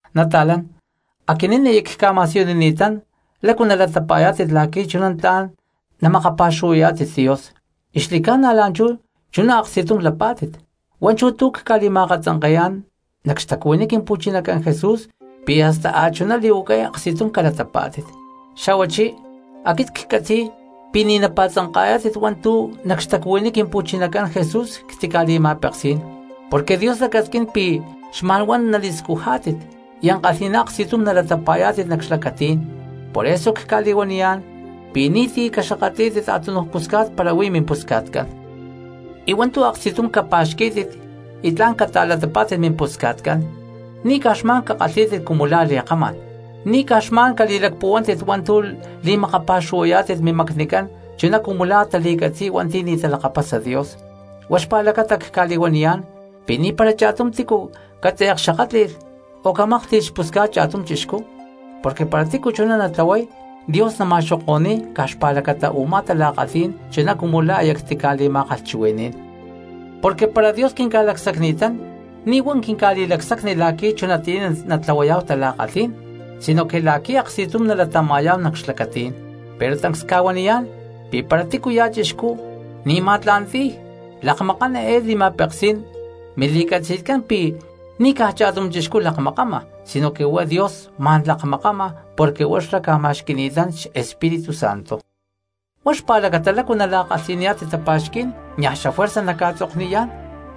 Nata̠lán, aquinín aya cca̠ma̠siyunini̠tán lácu nalatapa̠yá̠tit la̠qui̠ chuná tla̠n namakapa̠xuhuayá̠tit Dios, y xli̠ca̠na la̠nchú chuná aksti̠tum lapá̠tit. Huá chú tu̠ cca̠li̠ma̠akatzanke̠yá̠n nac xtacuhuiní Quimpu̠chinacán Jesús pi̠ hasta a̠chuná li̠huacay aksti̠tum calatapá̠tit. Xa̠huachí aquit ccatzi̠y pi̠ ni̠ napa̠tzanka̠yá̠tit hua̠ntu̠ nac xtacuhuiní Quimpu̠chinacán Jesús ctica̠li̠ma̠peksí̠n. Porque Dios lacasquín pi̠ xma̠n huá nali̠scujá̠tit y ankalhi̠ná aksti̠tum nalatapa̠yá̠tit nac xlacatí̠n, por eso cca̠li̠huaniyá̠n pi̠ ni̠ti̠ caxakátli̠lh a̠túnuj pusca̠t para huí mimpusca̠tcán. Y hua̠ntu̠ aksti̠tum capa̠xquí̠tit y tla̠n cata̠latapá̠tit mimpusca̠tcán ni̠ caj xma̠n cakalhí̠tit cumu la̠ li̠kamá̠n. Ni̠ caj xma̠n cali̠lacpuhuántit hua̠ntu̠ li̠makapa̠xuhuayá̠tit mimacnicán chuná cumu la̠ tali̠catzi̠y hua̠nti̠ ni̠ talakapasa Dios. Huá xpa̠lacata cca̠li̠huaniyá̠n pi̠ ni̠para cha̠tum tícu catze̠klakaxakátli̠lh o camáklhti̠lh xpusca̠t cha̠tum chixcú, porque para tícu chuná natlahuay Dios nama̠xoko̠ni̠y caj xpa̠lacata u̠má tala̠kalhí̠n chuná cumu la̠ aya ctica̠li̠ma̠kalhchuhui̠ní̠n. Porque para Dios quinca̠lacsacni̠tán ni̠ huá quinca̠li̠lacsacni la̠qui̠ chunatiyá natlahuayá̠hu tala̠kalhí̠n sinoque la̠qui̠ aksti̠tum nalatama̠yá̠hu nac xlacatí̠n. Pero tancs cca̠huaniyá̠n pi̠ para tícuya̠ chixcú ni̠ ma̠tla̠nti̠y, lakmakán eé li̠ma̠peksí̠n mili̠catzi̠tcán pi̠ ni̠ caj cha̠tum chixcú lakmakama sinoque huá Dios ma̠n lakmakama porque huá xlá ca̠ma̠xqui̠ni̠tán xEspíritu Santo. Huá xpa̠lacata lácu nala̠kalhi̠niyá̠tit tapa̠xquí̠n niaj xafuerza nacca̠tzokniyá̠n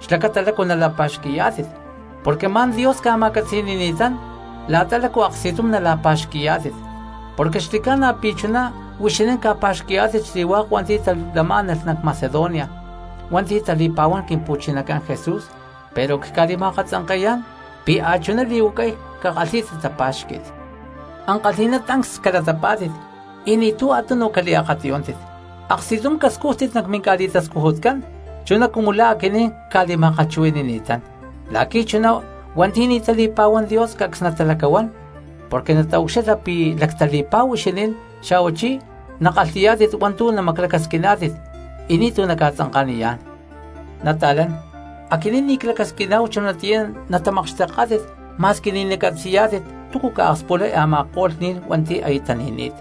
xlacata lácu nala̠pa̠xqui̠yá̠tit porque ma̠n Dios ca̠ma̠catzi̠ni̠ni̠tán la̠ta lácu aksti̠tum nala̠pa̠xqui̠yá̠tit. Porque xli̠ca̠na pi̠ chuná huixinín ca̠pa̠xqui̠yá̠tit xli̠hua̠k hua̠nti̠ tahuilá̠nalh nac Macedonia hua̠nti̠ tali̠pa̠huán Quimpu̠chinacán Jesús, pero cca̠li̠ma̠akatzanke̠yá̠n pi̠ a̠chuná li̠huacay cakalhí̠tit tapa̠xqui̠t. Ankalhi̠ná tancs calatapá̠tit y ni̠tu̠ a̠tunu caliakatiyúntit, aksti̠tum cascújtit nac minca̠li̠tascujutcán chuná cumu la̠ aquinín cca̠li̠ma̠kalhchuhui̠ni̠tán, la̠qui̠ chuná hua̠nti̠ ni̠ tali̠pa̠huán Dios cacs natalacahuán porque nataucxilha pi̠ lactali̠pa̠hu huixinín, xa̠huachí nakalhi̠yá̠tit hua̠ntu̠ namaclacasquiná̠tit y ni̠tu̠ naca̠tzanka̠niyá̠n. Nata̠lán, aquit ni̠ clacasquín chunatiyá natamakxteká̠tit ma̠squi ni̠ nacatzi̠yá̠tit túcu ca̠akspulay a̠ma̠ko̠lh ni̠n hua̠nti̠ aya tani̠ni̠t,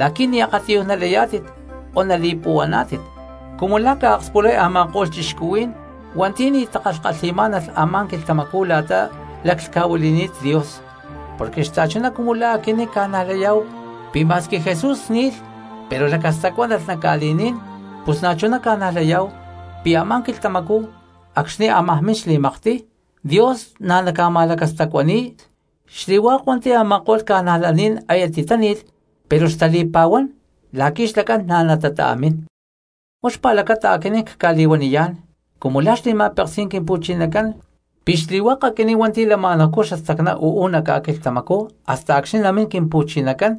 la̠qui̠ ni̠ akatiyuj nalayá̠tit o nali̠puhuaná̠tit cumu la̠ ca̠akspulay a̠ma̠ko̠lh cristianos hua̠nti̠ ni̠ takalhkalhi̠má̠nalh a̠má quilhtamacú la̠ta laclhca̠huili̠ni̠t Dios. Porque xta̠chuná cumu la̠ aquinín ca̠najlayá̠hu pi̠ ma̠squi Jesús ni̠lh pero lacastacuánalh nac ca̠li̠ní̠n, pus na̠chuná ca̠najlayá̠hu pi̠ a̠má quilhtamacú acxni̠ ámaj min xli̠maktiy, Dios na̠ naca̠ma̠lacastacuani̠y xli̠hua̠k hua̠nti̠ a̠ma̠ko̠lh cristianos aya titáni̠lh pero xtali̠pa̠huán, la̠qui̠ xlacán na̠ natata̠mín. Huá xpa̠lacata aquinín cca̠li̠huaniyá̠n cumu la̠ xli̠ma̠peksí̠n Quimpu̠chinacán pi̠ xli̠hua̠k aquinín hua̠nti̠ lama̠nahucú xastacná uú nac ca̠quilhtamacú hasta acxni̠ namín Quimpu̠chinacán,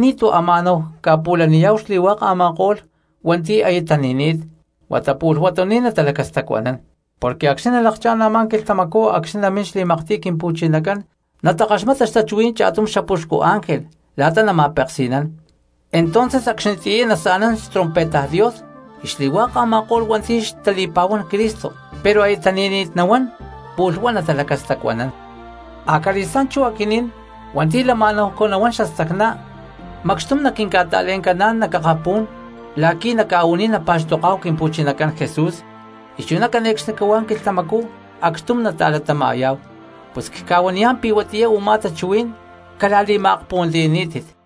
ni̠tu̠ ama̠náhu ca̠pu̠laniyá̠hu xli̠hua̠k a̠ma̠ko̠lh hua̠nti̠ aya tani̠ni̠t, huata pu̠lh huatuní̠n natalacastacuanán. Porque acxni̠ nalakchá̠n a̠má quilhtamacú acxni̠ namín xli̠maktiy Quimpu̠chinacán nata̠ctaya̠chi nac akapú̠n, natakaxmata xtachuhuí̠n cha̠tum xapuxcu ángel la̠ta nama̠peksi̠nán, entonces acxnitiyá nasa̠nán xtrompeta Dios y xli̠hua̠k a̠ma̠ko̠lh hua̠nti̠ xtali̠pa̠huán Cristo pero aya tani̠ni̠t nahuán pu̠lh huá natalacastacuanán. Acali̠stá̠n chú aquinín hua̠nti̠ lama̠náhu nahuán xastacná macxtum naquinca̠ta̠le̠ncaná̠n nac akapú̠n la̠qui̠ nac ca̠u̠ní̠n napa̠xtoká̠hu Quimpu̠chinacán Jesús, y chuná cane̠cxnicahuá quilhtamacú acxtum nata̠latama̠yá̠hu. Pus cca̠huaniyá̠n pi̠ huatiyá u̠má tachuhuí̠n cala̠li̠ma̠akpuhuantiyaní̠tit.